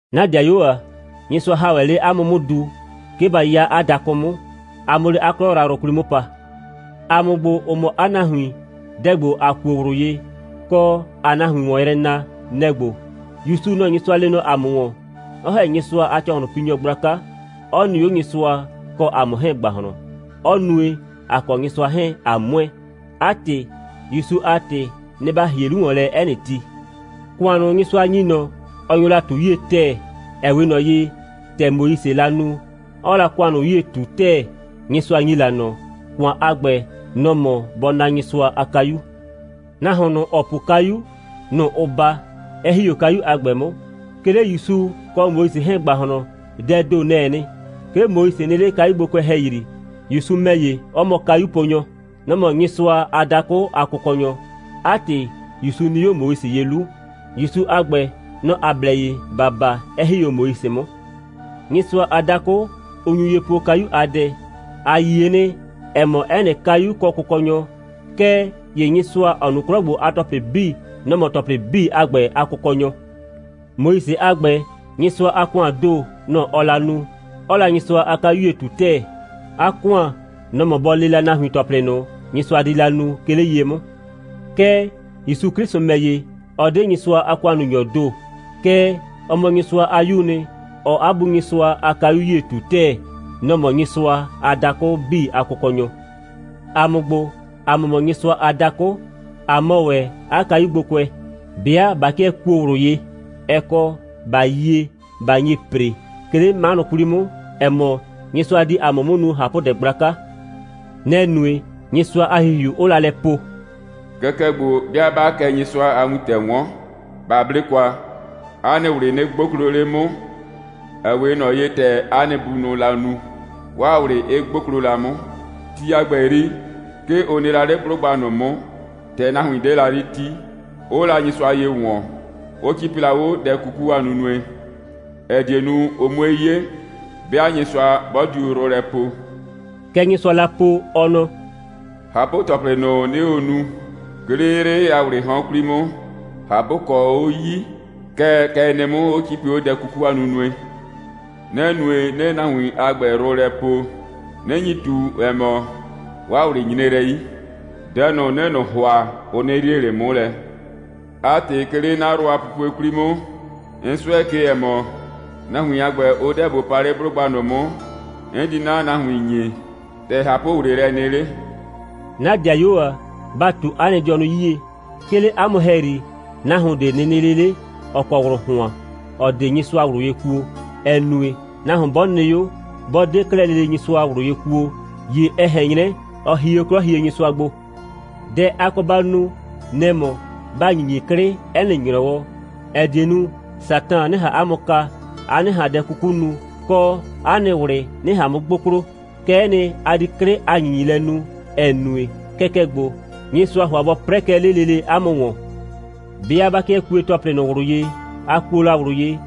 'Na 'dɩayuo ‑a, Nyɩsʋa ‑ha ‑wɛ 'le 'a mʋ 'mʋ du, 'ke ba 'ya 'a dakʋ 'mʋ, a 'mʋ 'le 'a 'klɔ yrayrʋ 'kwli 'mʋ pa. ‑A mʋ ‑gbo, ‑ʋ mɔ 'a nahuin, dɛ ‑gbo, ‑a kuo ꞊wlʋ ye, kɔ, ‑aa nahuin ‑wɔn yrɛ na, nɛ‑ ‑gbo: ‑Yusu, nɔ‑ Nyɩsʋa lee nɔ ‑a mʋ ‑wɔn, 'ɔ ‑hɛ Nyɩsʋa a ‑cɔhlʋnpinyɔ gblaka, 'ɔ nɩ 'o Nyɩsʋa kɔ ‑a mʋ 'hɛɛn a ‑gbahlɔn, 'ɔ nue, ‑a kɔ Nyɩsʋa 'hɛɛn, ꞊a ‑mʋɛ. 'A ‑tɩ, ‑Yusu a ‑tɩ, nɩ‑ ‑ba ‑hie 'lu ‑wɔn lɛ 'ɛ nɩ ti. ‑Kʋan ꞊nʋ, Nyɩsʋa ‑nyi ꞊nɔ, ɔ nyo la ꞊tu 'yie ‑tɛɛ, ‑ɛ 'we ꞊nɔ ye, ‑tɛ Moisee la nu, 'ɔɔ la ‑kʋan ꞊nʋ 'yie ꞊tu ‑tɛɛ, Nyɩsʋa ‑nyi la ꞊nɔ. ‑Kʋan a ‑gbɛ, nɔ‑ mɔ bɔ naa Nyɩsʋa a kayu. Nahuon ꞊nʋ, ‑ɔ po kayu, nɔ‑ ʋʋ baa, 'ɛ ‑hi 'o kayu a ‑gbɛ 'mʋ. 'Ke 'le ‑Yusu kɔ Moise 'hɛɛn ‑gbahlɔn, dɛɛ ‑do, nɛ‑ɛ nɩ. 'Ke Moise nɩ 'le kayugbokʋɛ ‑hɛyri, ‑Yusu ‑mɛ ‑ye, 'ɔ mɔ kayuponyɔ. Nɔ‑ mɔ Nyɩsʋa a dakʋ a Kʋkɔnyɔ. 'A ‑tɩ, ‑Yusu nɩ 'o Moise ye 'lu. ‑Yusu a ‑gbɛ, nɔ‑ ‑a blɛ ye ‑ba baa, 'ɛ ‑hi 'o Moise 'mʋ. Nyɩsʋa a dakʋ, 'n nyu ye poo kayu a dɛ: ‑A yie nɩ, ‑ɛ mɔ, 'ɛ nɩ kayu kɔ kʋkɔnyɔ. Kɛɛ ‑ye Nyɩsʋa, ‑ɔ nu 'klɔ ‑gbo a ‑tɔplɩ 'bii, nɔ‑ mɔ ‑tɔplɩ 'bii a ‑gbɛ a Kʋkɔnyɔ. Moise a ‑gbɛ, Nyɩsʋa a ‑kʋaan ‑doo, nɔ‑ ɔɔ la nu, 'ɔɔ la Nyɩsʋa a kayu 'yie ꞊tu ‑tɛɛ. 'A ‑kʋan, nɔ‑ mɔ bɔ le la nahuin ‑tɔplɩ ꞊nʋ, Nyɩsʋa di la nu, 'ke 'le ye 'mʋ. Kɛɛ, ‑Yusu 'Klɩsʋ ‑mɛ ‑ye, ɔ 'de Nyɩsʋa a ‑kʋannunyɔɔ ‑do, kɛɛ, ɔ mɔ Nyɩsʋa a 'Yuu nɩ, 'ɔɔ 'a Bu Nyɩsʋa a kayu 'yie ꞊tu ‑tɛɛ. Nɔ‑ mɔ Nyɩsʋa a dakʋ 'bii a Kʋkɔnyɔ. ‑A mʋ ‑gbo, ‑a mʋ mɔ Nyɩsʋa a dakʋ, ꞊a mɔ ‑wɛ 'a kayugbokʋɛ, 'bɩa ꞊ba 'kɩɛ kuo ꞊wlʋ ye, ɛ kɔ, ꞊ba yie, ꞊ba nye ‑pre, 'ke 'le 'manʋ 'kwli 'mʋ, ‑ɛ mɔ, Nyɩsʋa di ‑a mʋ 'mʋ nu ꞊hapʋdɛ gblaka. Nɛ‑ nue, Nyɩsʋa a ‑Hihiu 'ʋʋ la lɛ po: «Kɛkɛ ‑gbo, 'bɩa 'baa kɛ Nyɩsʋa a wintɛ 'wɔn, ba 'ble kwa. 'A nɩ ꞊wlɩ nɩ 'gboklo 'le 'mʋ, ‑ɛ 'we ꞊nɔ ye, ‑tɛ 'a nɩ bunʋʋ la nu, 'waa ꞊wlɩ 'ɩ 'gboklo la 'mʋ. Ti a ‑gbɛ 'yri, 'ke ʋ nɩ la 'le 'blʋgba ꞊nʋ 'mʋ, ‑tɛ nahuin 'de la 'le 'ti, 'ʋʋ la Nyɩsʋa ye ‑wɔn, 'ʋ 'cipi la 'o dɛ 'kuku a nunue, ‑ɛ die nu, ʋ 'mue 'ye, 'bɩa Nyɩsʋa 'bɔ diu yrʋ lɛ poo.» Kɛ Nyɩsʋaa la po, ɔ nɔ: «꞊Hapʋ‑tɔplɩ ꞊nʋ, 'nɩɩ o nu, 'ke 'le 'yrɩ a ‑wlɩɩ 'hɔn 'kwli 'mʋ, ꞊hapʋkɔ, 'ʋ 'yi, kɛɛ, kɛ ɛ nɩ 'mʋ, 'ʋ 'cipi 'o dɛ 'kuku a nunue. Nɛ‑ nue, 'nɩɩ nahuin a ‑gbɛ yrʋ lɛ poo, 'nɩ nyi ꞊tu, ‑ɛ mɔ, 'waa ꞊wlɩ nyre lɛ 'yi. Dɛ ꞊nʋ, 'nɩɩ ꞊nʋ ‑hʋa, ʋ 'nɩ yrie ꞊le 'mʋ lɛ. 'A ‑tɩ, 'ke 'le 'na yrʋ a pupue 'kwli 'mʋ, 'n 'sʋɛ ke, ‑ɛ mɔ, nahuin a ‑gbɛ, ʋ 'deɛ bʋ pa 'le 'blʋgba ꞊nʋ 'mʋ, 'n di 'na nahuin ‑nyi, ‑tɛ ꞊hapʋ‑wleelɛ nɩ 'le.» 'Na 'dɩayuo ‑a, ba ꞊tu 'a nɩ dɩɔnʋ 'yie, 'ke 'le 'a mʋ ‑hɛyri, nahuon ꞊de nɩ nɩ 'le 'le, ‑ɔ kɔ ꞊wlʋ ‑hʋan, ‑ɔ 'de Nyɩsʋa ꞊wlʋ ye kuo, ‑ɛ nue, nahuon 'bɔ nɩ 'o, 'bɔ 'de 'klɛɛ lele Nyɩsʋa ꞊wlʋ ye kuo, ‑ye ɛ ꞊hɛn 'nyrɛ, ɔ hie 'o 'Klɔhienyɩsʋa gbo. Dɛ a kɔ ba nu, nɛ‑ mɔ, ba ‑nyinyi 'klɩ 'ɛ nɩ ‑nyrɔwɔ, ‑ɛ die nu, Satan 'nɩ ꞊han 'a mʋ kaa, a 'nɩ ꞊han dɛ 'kuku nu, kɔ, 'a nɩ ꞊wlɩ 'nɩ ꞊han 'mʋ 'gboklo. Kɛ'ɛ nɩ, a di 'klɩ a ‑nyinyilɛ nu, ‑ɛ nue, kɛkɛ ‑gbo, Nyɩsʋaa ‑hʋa bɔ 'prɛɛ kɛ 'le lele ‑a mʋ ‑wɔn. 'Bɩa ꞊ba 'kɩɛ kue ‑tɔplɩ ꞊nʋ ꞊wlʋ ye, ‑a kuo la ꞊wlʋ ye,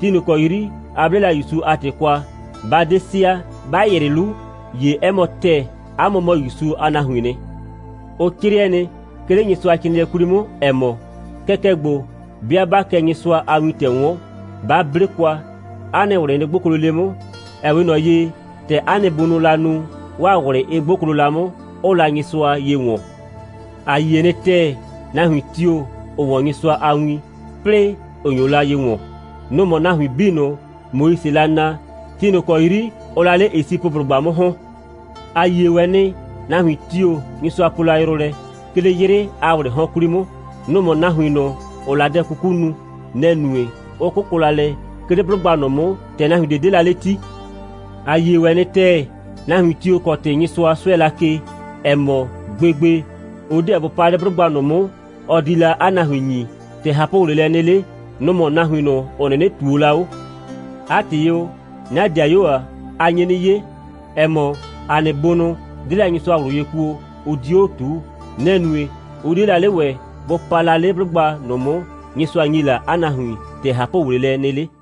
ti ꞊nʋ ‑kɔ 'yri ‑a 'ble la ‑Yusu a ‑tɩ kwa, ꞊ba 'de sɩa, ꞊ba ‑yrɩ 'lu, ‑ye 'ɛ mɔ ‑tɛɛ, ‑a mʋ mɔ ‑Yusu a nahuiin nɩ. Ʋ 'crɩɛ nɩ, 'ke 'le Nyɩsʋacrɩɩnɩɛ 'kwli 'mʋ, ‑ɛ mɔ: «Kɛkɛ ‑gbo, 'bɩa 'baa kɛ Nyɩsʋa a wintɛ 'wɔn, ba 'ble kwa. 'A nɩ ꞊wlɩ nɩ 'gboklo 'le 'mʋ, ‑ɛ 'we ꞊nɔ ye, ‑tɛ 'a nɩ bunʋʋ la nu, 'waa ꞊wlɩ 'ɩ 'gboklo la 'mʋ, 'ʋʋ la Nyɩsʋa ye ‑wɔn.» A yie nɩ ‑tɛɛ, nahuin tio‑, ‑ʋ 'wɔn Nyɩsʋa a win, 'plɩɩ ‑ʋ nyo la ye ‑wɔn. Nʋ‑ mɔ nahuin 'bii ꞊nʋ, Moisee la naa, ti ꞊nʋ ‑kɔ 'yri ʋʋ la 'le Esipʋblʋgba 'mʋ ‑hɔn. A yie ‑wɛ nɩ, nahuin tio‑ Nyɩsʋa poo la yrʋ lɛ, 'ke 'le 'yrɩ a ‑wlɩɩ 'hɔn 'kwli 'mʋ. Nʋ‑ mɔ nahuin ꞊nʋ, ‑ʋʋ la dɛ 'kuku nu. Nɛ‑ nue, 'ʋ 'kʋkʋ la lɛ, 'ke 'le 'blʋgba ꞊nʋ 'mʋ, ‑tɛ nahuin ꞊de 'de la 'le 'ti. A yie ‑wɛ nɩ ‑tɛɛ, nahuin tio‑ kɔ ‑tɩ Nyɩsʋa 'sʋɛ la ke, ‑ɛ mɔ, gbegbe, ʋ 'deɛ bʋ pa 'le 'blʋgba ꞊nʋ 'mʋ, ɔ di la 'a nahuin ‑nyi, ‑tɛ ꞊hapʋ‑wleelɛ nɩ 'le, nʋ‑ mʋ nahuin ꞊nʋ, ‑ʋ 'nɩnɩ ꞊tuo la 'o. 'A ‑tɩ o, 'na 'dɩayuo ‑a, ‑a nye 'nɩ 'ye, ‑ɛ mɔ, ‑a nɩ bunʋ 'de la Nyɩsʋa ꞊wlʋ ye kuo, 'ʋ 'dio 'o ꞊tuu. Nɛ‑ nue, 'ʋ 'die la 'le ‑wɛ bʋ pa la 'le 'blʋgba ꞊nʋ 'mʋ, Nyɩsʋa ‑nyi la 'a nahuin, ‑tɛ ꞊hapʋ‑wleelɛ nɩ 'le.